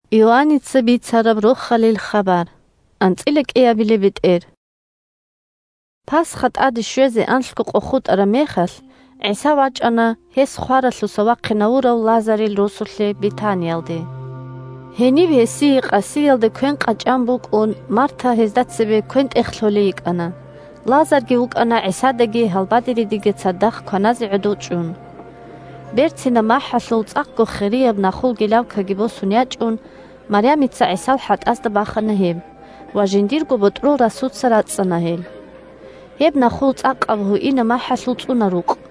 «Дун кидаго гуро нужгун вукӀунев» Пасха тӀаде щвезе анлъго къо хутӀараб мехалъ, ГӀиса вачӀана гьес хваралъуса вахъинавурав Лазарил росулъе Бетаниялде. Гьениб гьесие къасиялде квен къачӀан букӀун, Марта гьезда цебе квен-тӀех лъолей йикӀана, Лазарги вукӀана ГӀисадаги гьалбадеридаги цадахъ кваназе гӀодов чӀун. Берцинаб махӀалъул цӀакъго хирияб нахул гелавкаги босун ячӀун, Марямица ГӀисал хӀатӀазда бахана гьеб ва жиндирго ботӀрол расуца рацӀцӀана гьел. Гьеб нахул цӀакъаб гьуинаб махӀалъул цӀуна рукъ.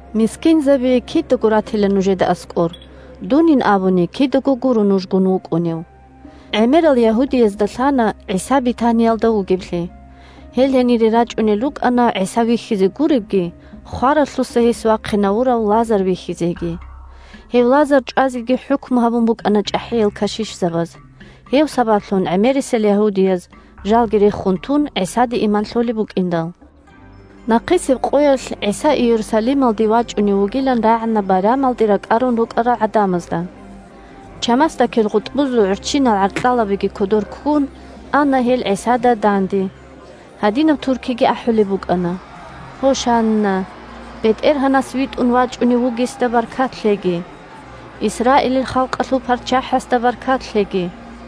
Мискинзаби кидаго ратила нужеда аскӀор. Дунин абуни, кидаго гуро нужгун вукӀунев. ГӀемерал ягьудиязда лъана ГӀиса Бетаниялда вугевлъи. Гьел гьенире рачӀунел рукӀана ГӀиса вихьизе гуребги, хваралъуса гьес вахъинавурав Лазар вихьизеги. Гьев Лазар чӀвазеги хӀукму гьабун букӀана чӀахӀиял кашишзабаз, гьев сабаблъун гӀемерисел ягьудияз, жалги рехун тун, ГӀисаде иман лъолеб букӀиндал. Нахъисеб къоялъ ГӀиса Иерусалималде вачӀунев вугилан рагӀана байрамалде ракӀарун рукӀарал гӀадамазда. Чамасдакил гъутӀбузул гӀурччинал гӀаркьалабиги кодор ккун ана гьел ГӀисада данде. Гьадинаб туркиги ахӀулеб букӀана: – Гьошанна! БетӀергьанас витӀун вачӀунев вугесда баркат лъеги! Исраилил халкъалъул ПарччахӀасда баркат лъеги!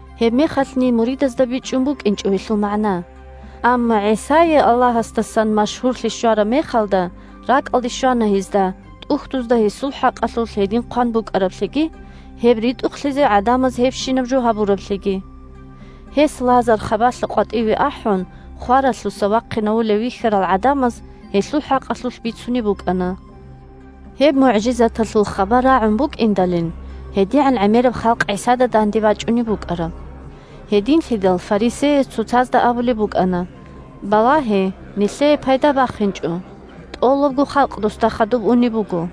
(Гьебмехалъни муридазда бичӀчӀун букӀинчӀо гьелъул магӀна. Амма ГӀисае Аллагьасдасан машгьурлъи щвараб мехалда ракӀалде щвана гьезда ТӀухьдузда гьесул хӀакъалъулъ гьедин хъван букӀараблъиги, гьеб ритӀухълъизе гӀадамаз гьебщинаб жо гьабураблъиги.) Гьес Лазар, хабалъа къватӀиве ахӀун, хваралъуса вахъинавулев вихьарал гӀадамаз гьелъул хӀакъалъулъ бицунеб букӀана. Гьеб мугӀжизаталъул хабар рагӀун букӀиндалин гьедигӀан гӀемераб халкъ ГӀисада данде бачӀунеб букӀараб. Гьединлъидал фарисеяз цоцазда абулеб букӀана: – Балагье, нилъее пайда бахинчӀо! ТӀолабго халкъ досда хадуб унеб буго!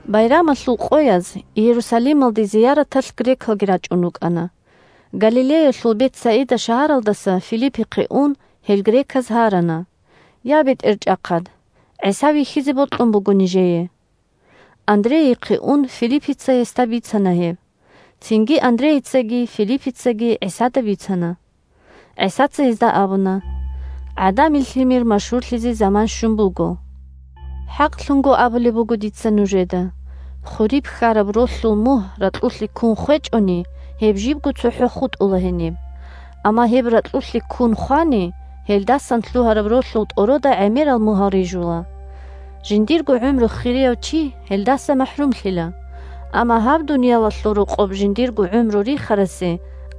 Байрамалъул къояз Иерусалималде зияраталъ грекалги рачӀун рукӀана. Галилеялъул Бетсаида шагьаралдаса Филиппихъе ун, гьел греказ гьарана: – Я, бетӀерчӀахъад! ГӀиса вихьизе бокьун буго нижее. Андрейихъе ун Филиппица гьесда бицана гьеб. Цинги Андрейицаги Филиппицаги ГӀисада бицана. ГӀисаца гьезда абуна: – ГӀадамил Лъимер машгьурлъизе заман щун буго. ХӀакълъун абулеб буго дица нужеда: хуриб хьараб ролъул мугь ракьулъе ккун хвечӀони, гьеб жибго цохӀо хутӀула гьениб. Амма гьеб ракьулъе ккун хвани, гьелдасан лъугьараб ролъул тӀорода гӀемерал мугьал рижула. Жиндирго гӀумру хирияв чи гьелдаса махӀрумлъила. Амма гьаб дуниялалъул рокъоб жиндирго гӀумру рихарасе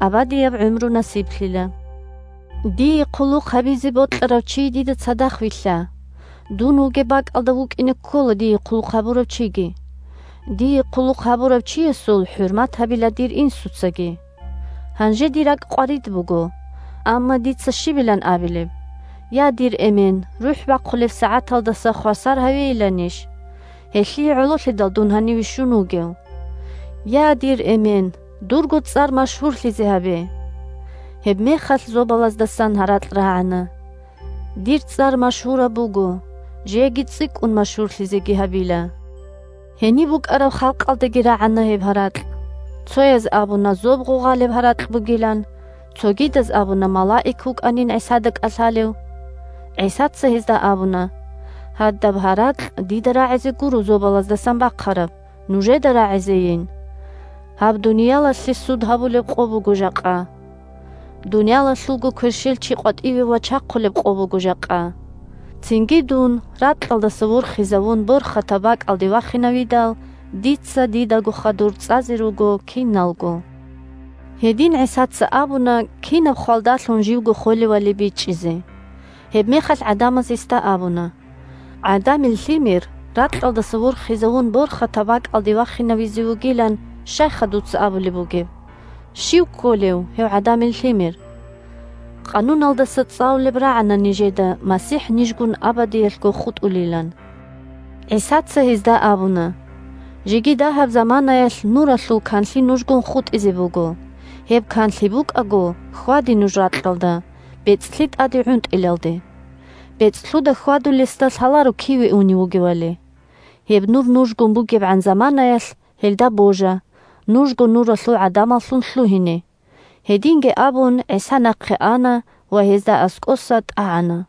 абадияб гӀумру насиблъила. Дие хъулухъ гьабизе бокьарав чи дида цадахъ вилълъа. Дун вугеб бакӀалда вукӀине ккола дие хъулухъ гьабурав чиги. Дие хъулухъ гьабурав чиясул хӀурмат гьабила дир Инсуцаги. Гьанже дир ракӀ къварид буго. Амма дица щибилан абилеб? Я, дир Эмен, рухӀ бахъулеб сагӀаталдаса хвасар гьавейиланищ? Гьелъие гӀололъидал дун гьаниве щун вугев. Я, дир Эмен, дурго цӀар машгьурлъизе гьабе! Гьебмехалъ зобалаздасан гьаракь рагӀана: – Дир цӀар машгьураб буго, жеги цӀикӀкӀун машгьурлъизеги гьабила. Гьениб букӀараб халкъалдаги рагӀана гьеб гьаракь. Цояз абуна зоб гъугъалеб гьаракь бугилан. Цогидаз абуна малаик вукӀанин ГӀисада кӀалъалев. ГӀисаца гьезда абуна: – Гьадаб гьаракь дида рагӀизе гуро зобалаздасан бахъараб, нужеда рагӀизейин. Гьаб дуниялалъе суд гьабулеб къо буго жакъа. Дуниялалъулго кверщелчи къватӀиве вачахъулеб къо буго жакъа. Цинги дун, ракьалдаса ворхизавун, борхатаб бакӀалде вахинавидал, дица дидаго хадур цӀазе руго киналго. (Гьедин ГӀисаца абуна кинаб хвалдалъун живго холевали бичӀчӀизе.) Гьебмехалъ гӀадамаз гьесда абуна: – «ГӀадамил Лъимер, ракьалдаса ворхизавун, борхатаб бакӀалде вахинавизе вугилан» щайха дуца абулеб бугеб? Щив кколев гьев ГӀадамил Лъимер? Къануналдаса цӀалулеб рагӀана нижеда МасихӀ нижгун абадиялъго хутӀулилан. ГӀисаца гьезда абуна: – Жеги дагьаб заманаялъ Нуралъул канлъи нужгун хутӀизе буго. Гьеб канлъи букӀаго, хьваде нуж ракьалда, бецӀлъи тӀаде гӀунтӀилалде. БецӀлъуда хьвадулесда лъаларо киве унев вугевали. Гьеб Нур нужгун бугебгӀан заманаялъ, гьелда божа, нужго Нуралъул гӀадамаллъун лъугьине. Халкъ ГӀисада божуларо Гьединги абун, ГӀиса нахъе ана ва гьезда аскӀоса тӀагӀана.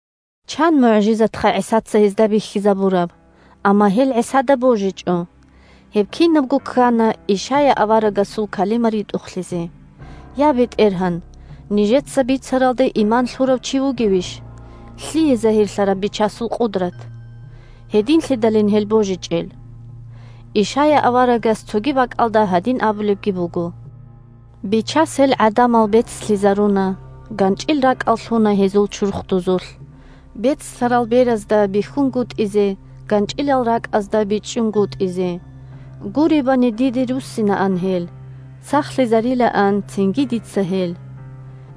Чан мугӀжизатха ГӀисаца гьезда бихьизабураб, амма гьел ГӀисада божичӀо. Гьеб кинабго ккана Ишая аварагасул калима ритӀухълъизе: «Я, БетӀергьан, нижеца бицаралде иман лъурав чи вугевищ? Лъие загьирлъараб Бичасул къудрат?» Гьединлъидалин гьел божичӀел. Ишая аварагас цоги бакӀалда гьадин абулебги буго: «Бичас гьел гӀадамал бецлъизаруна, ГанчӀил ракӀал лъуна гьезул чурхдузулъ: Бецлъарал беразда бихьунгутӀизе, ГанчӀилал ракӀазда бичӀчӀунгутӀизе. Гуребани, диде руссинаан гьел, Сахлъизарилаан цинги дица гьел».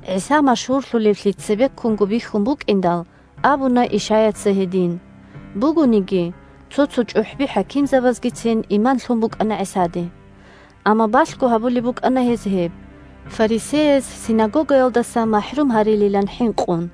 ГӀиса машгьурлъулевлъи цебеккунго бихьун букӀиндал абуна Ишаяца гьедин. Бугониги, – цо-цо чӀухӀби-хӀакимзабазгицин иман лъун букӀана ГӀисаде. Амма балъго гьабулеб букӀана гьез гьеб, фарисеяз синагогаялдаса махӀрум гьарилилан хӀинкъун.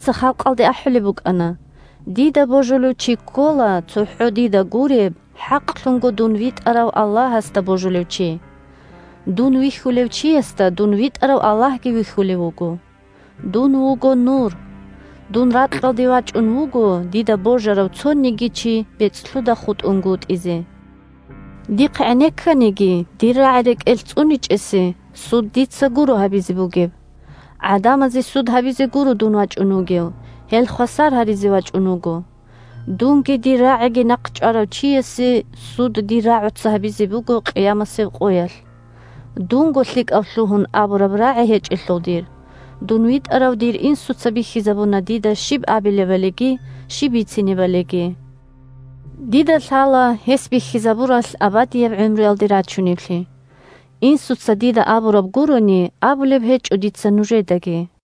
ГӀисаца халкъалде ахӀулеб букӀана: – Дида божулев чи ккола, цохӀо дида гуреб, хӀакълъунго дун витӀарав Аллагьасда божулев чи. Дун вихьулев чиясда дун витӀарав Аллагьги вихьулев вуго. Дун вуго – Нур. Дун ракьалде вачӀун вуго дида божарав цониги чи бецӀлъуда хутӀунгутӀизе. Дихъ гӀенекканиги, дир рагӀи рекӀелъ цӀуничӀесеги суд дица гуро гьабизе бугеб. ГӀадамазе суд гьабизе гуро дун вачӀун вугев, гьел хвасар гьаризе вачӀун вуго. Дунги дир рагӀиги нахъчӀварав чиясе суд дир рагӀуца гьабизе буго къиямасеб къоялъ. Дунго лъикӀав лъугьун абураб рагӀи гьечӀелъул дир, дун витӀарав дир Инсуца бихьизабуна дида щиб абилебалиги, щиб бицинебалиги. Дида лъала гьес бихьизабуралъ абадияб гӀумруялде рачунеблъи. Инсуца дида абураб гурони, абулеб гьечӀо дица нужедаги.